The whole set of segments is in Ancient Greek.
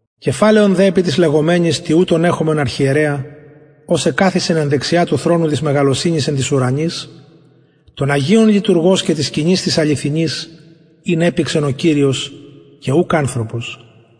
κεφαλαιον δε επι τοις λεγομενοις τοιουτον εχομεν αρχιερεα ος εκαθισεν εν δεξια του θρονου της μεγαλωσυνης εν τοις ουρανοις των αγιων λειτουργος και της σκηνης της αληθινης ην επηξεν ο κυριος και ουκ ανθρωπος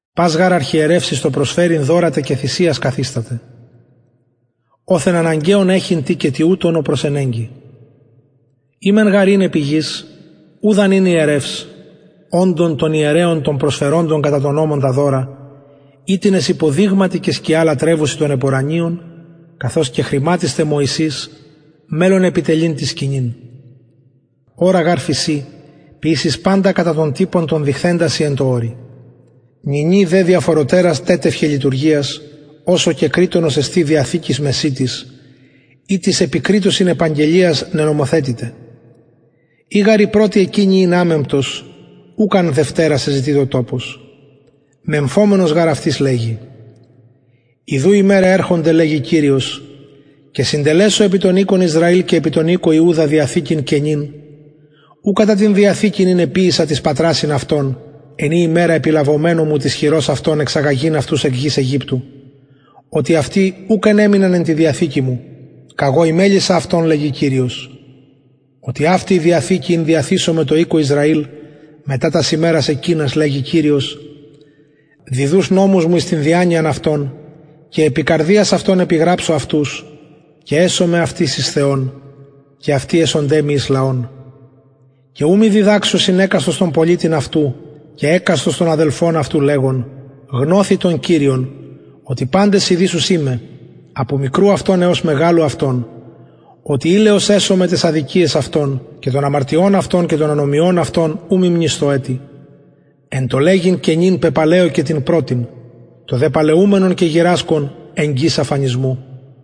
πας γαρ αρχιερευς εις το προσφερειν δωρα τε και θυσιας καθισταται οθεν αναγκαιον εχειν τι και τουτον ο προσενεγκη ει μεν γαρ ην επι γης ουδ αν ην ιερευς οντων των ιερεων των προσφεροντων κατα τον νομον τα δωρα οιτινες υποδειγματι και σκια λατρευουσιν των επουρανιων καθως κεχρηματισται μωυσης μελλων επιτελειν την σκηνην ορα γαρ φησιν ποιησεις παντα κατα τον τυπον τον δειχθεντα σοι εν τω ορει νυνι δε διαφορωτερας τετυχεν λειτουργιας οσω και κρειττονος εστιν διαθηκης μεσιτης ητις επι κρειττοσιν επαγγελιαις νενομοθετηται ει γαρ η πρωτη εκεινη ην αμεμπτος ουκ αν δευτερας εζητειτο τοπος μεμφομενος γαρ αυτοις λεγει ιδου ημεραι ερχονται λεγει κυριος και συντελεσω επι τον οικον ισραηλ και επι τον οικον ιουδα διαθηκην καινην ου κατα την διαθηκην ην εποιησα τοις πατρασιν αυτων εν ημερα επιλαβομενου μου της χειρος αυτων εξαγαγειν αυτους εκ γης αιγυπτου οτι αυτοι ουκ ενεμειναν εν τη διαθηκη μου καγω ημελησα αυτων λεγει κυριος οτι αυτη η διαθηκη ην διαθησομαι τω οικω ισραηλ μετα τας ημερας εκεινας λεγει κυριος διδους νομους μου εις την διανοιαν αυτων και επι καρδιας αυτων επιγραψω αυτους και εσομαι αυτοις εις θεον και αυτοι εσονται μοι εις λαον και ου μη διδαξωσιν εκαστος τον πολιτην αυτου και εκαστος τον αδελφον αυτου λεγων γνωθι τον κυριον οτι παντες ειδησουσιν με απο μικρου αυτων εως μεγαλου αυτων οτι ιλεως εσομαι ταις αδικιαις αυτων και των αμαρτιων αυτων και των ανομιων αυτων ου μη μνησθω ετι εν τω λεγειν καινην πεπαλαιωκεν την πρωτην το δε παλαιουμενον και γηρασκον εγγυς αφανισμου